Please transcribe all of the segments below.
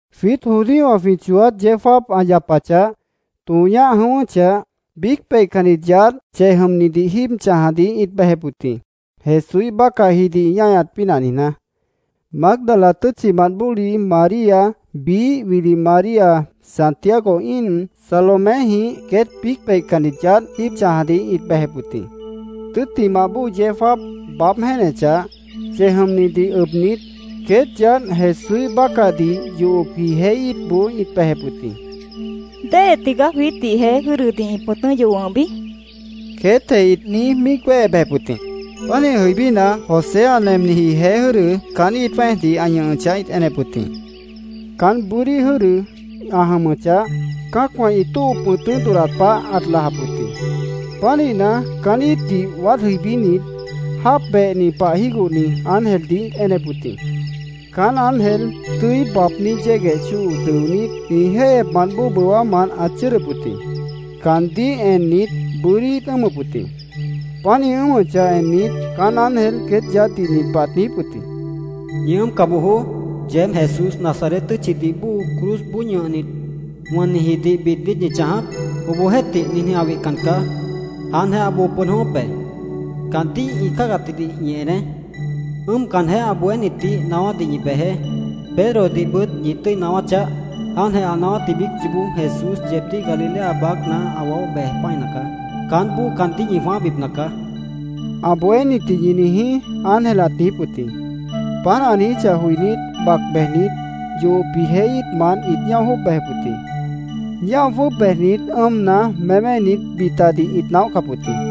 Jwiít judíowã jwĩ chooát yeó jáap ã yapachah, tõo ñáh jʉ̃ʉ́wʉ́chah, biíc peihcannit yaádh chej jʉmnidih jíib chãjadih ĩt bejep wʉt jĩ, Jesúíh bácahjidih ĩ ñáñat pínah niijná. Mágdala tʉ́tchimant bóli María, biíh wili María Santiago íin, Saloméjĩh, queét biíc peihcannit yaádh jíib chãjadih ĩt bejep wʉt jĩ. Tʉ́ttimah bóo yeó jáap baáb jéenechah, chej jʉmnidih ʉbnit, queét yaádh Jesúíh bácahdih yohopji jeé íitboó ĩt bejep wʉt jĩ. —¿Déhe tigaá jwiítdih jeé jʉ́dʉdih ĩ pʉ̃tʉ́ yoh wʉ̃hbi? queétjeh ĩt niíj míic wéhe bejep wʉt jĩ. Pánih jʉibína, José ã nemniji jeé jʉ́dʉ caán íit jwẽ́ejdih ã ñʉhʉchah ĩt enep wʉt jĩ. Caán bʉ́dí jʉ́dʉ ã jʉmʉchah, cã́acwã ĩ tóo pʉ̃tʉ́ dodhdat pah ãt lajap wʉt jĩ. Pánihna, caán íitdih waád jʉibínit, jáap behni pah jígohni ángeldih ĩt enep wʉt jĩ. Caán ángel tʉ́i baabní yégueh chóo dʉonít, ĩ jéihyepmant bóo bʉwámant ãt chʉ́ʉdʉp wʉt jĩ. Caandíh ennit, bʉ́dí ĩt ʉ́ʉmʉp wʉt jĩ. Páant ĩ ʉ́ʉmʉchah ennit, caán ángel queét yaádhdih nin pah ãt niijíp wʉt jĩ: —¡Ñi ʉ́ʉmca bojoó! ¿Yeéb Jesús, Nazaret tʉ́tchidih bóo cruzboó ñʉhnit, wʉnnijidih bid niít ñi chãjap? Obohjeéhtih, ninjĩh ã wihcan caá. Jáantjeh ã boo pʉd jʉ̃ʉ́wʉ́p be. Caandíh ĩ cáagatjidih ñi eneé. Ʉ́ʉmcanjeh, ã bohénitdih naáwádih ñi bejeé. Pedrodihbʉt ñi tʉ́i naáwá chaáh. ‘Jáantjeh ã naáwátji biíc yoobó Jesús yeebdíh Galilea baácna ã waóh bej pã́ina caá. Caánboó caandíh ñi jwãáhbipna caá’, ã bohénitdih ñi niijí, ángel ãt niijíp wʉt jĩ. Páant ã niijíchah joinít, bac bejnit, yohopji jeé íitmant ĩt ñáo jwʉ́ʉb bejep wʉt jĩ. Ñáo jwʉ́ʉb bejnit, ʉ́ʉmna, méménit, bitadih ĩt naóhcap wʉt jĩ.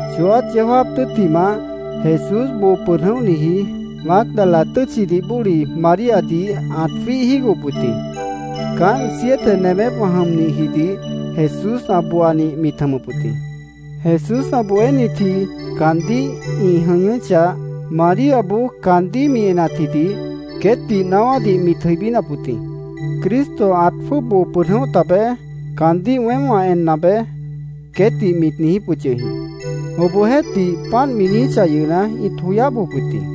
Chooát yeó jáap tʉ́ttimah, Jesús boo pʉd jʉ̃óhniji Mágdala tʉ́tchidih bóli Maríadih ãt jwíih jígohop wʉt jĩ. Caánt siete nemépwã jʉmnihjidih Jesús ã booanih mit jʉmʉp wʉt jĩ. Jesús ã bohénitji caandíh ĩ jʉñʉ́chah, Maríaboó caandíh mi enatjidih queétdih naáwádih mit jʉibínap wʉt jĩ. “Cristo ãt jwʉ́ʉb boo pʉd jʉ̃óh tabeé. Caandíh weém wã enna be”, queétdih mitih niijíp wʉt yʉh jĩ. Obohjeéhtih, páant mi niijíchah yʉhna, ĩt joyáh bojop wʉt jĩ.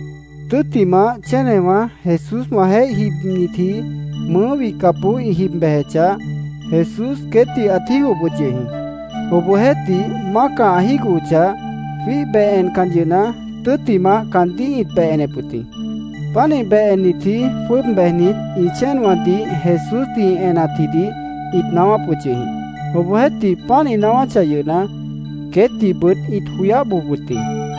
Tʉ́ttimah, chénewã Jesúswãjeéh jibnitji mʉʉ́ wihcapboó ĩ jib bejechah, Jesús queétdih ãt jígohop wʉt yʉh jĩ. Obohjeéhtih, mácah ã jígohochah, jwíih beh encan yʉhna, tʉ́ttimah, caandíh ĩt beh enep wʉt jĩ. Pánih beh ennitji jwʉ́ʉb bejnit, ĩ chéenwãdih Jesúsdih ĩ enatjidih ĩt naáwáp wʉt yʉh jĩ. Obohjeéhtih, páant ĩ naáwáchah yʉhna, queétdihbʉt ĩt joyáh bojop wʉt jĩ.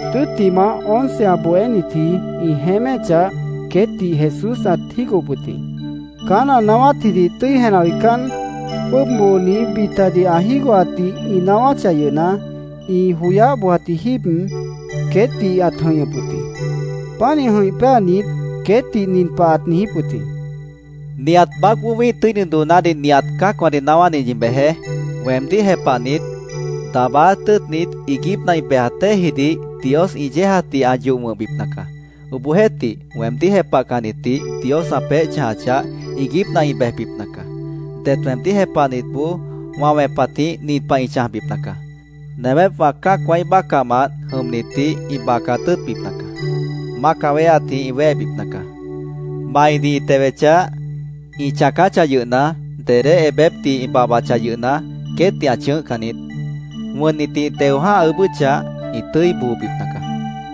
Tʉ́ttimah, once ã bohénitji ĩ jeéméchah, queétdih Jesús ãt jígohop wʉt jĩ. Caán ã naáwátjidih tʉ́i jenah joicán, jwʉ́ʉb booni bitadih ã jígohatdih ĩ naáwáchah yʉhna, ĩ joyáh bojatji jíib queétdih ãt jʉ̃ihñʉp wʉt jĩ. Pánih jʉ̃ih péanit, queétdih nin pah ãt niijíp wʉt jĩ: “Nihat baácboó wĩ́ih tʉ́ini doonádih nihat cã́acwãdih naáwádih ñi bejeé. Weemdíh jepahnit, daabáát tʉ́ʉtnit, iiguípna ĩ bejat déejidih Dios ĩ yéejatdih ã yoh wʉ̃hbipna caá. Obohjeéhtih, weemdíh jepahcannitdih Dios ã peéh chãjachah, iiguípna ĩ bejbipna caá. Det weemdíh jepahnitboó wã wẽpatjĩh nin pah ĩ chãjbipna caá: Nemépwã cã́acwãíh bácahmant jʉmnitdih ĩ bacat tʉ́ʉtbipna caá. Mácah wéheatjĩh ĩ wéhebipna caá. Maidih ĩ tewechah, ĩ chãacáchah yʉhna, dedé ebépdih ĩ babhbachah yʉhna, queétdih ã chʉ̃ʉ́hcan niít. Wʉnnitdih ĩ teo jã́ha ʉʉ́bʉ́chah, ĩ tʉ́i boobipna caá”, ãt niijíp wʉt jĩ.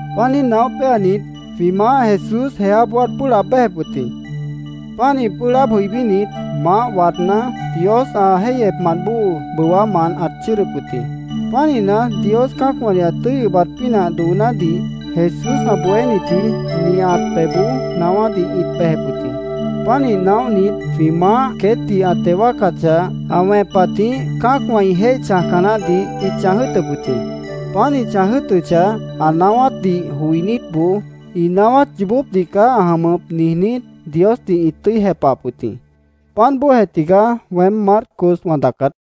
Páant niíj naóh péanit, jwĩ Maáh Jesús jeáboó ãt pʉ́ʉh laab béjep wʉt jĩ. Pánih pʉ́ʉh laáb jʉibínit, maáh waadná, Dios ã jéihyepmant bóo bʉwámant ãt chʉ́ʉdʉp wʉt jĩ. Pánihna, Dios cã́acwãdih ã tʉ́i ʉbat pínah doonádih Jesús ã bohénitji nihat pebhboó naáwádih ĩt bejep wʉt jĩ. Pánih naóhnit, jwĩ Maáh queétdih ã teo wáacachah, ã wẽpatjĩh cã́acwã ĩ jéih chãjca naáhdih ĩt chãj jʉ́ʉtʉp wʉt jĩ. Páant ĩ chãj jʉ́ʉtʉchah, ã naáwátdih joinítboó, “Ĩ naáwát yoobópdih caá ã jʉmʉp”, niijnít, Diosdih ĩt tʉ́i jepahap wʉt jĩ. Páant bóojeh tigaá weém Marcos wã daacát.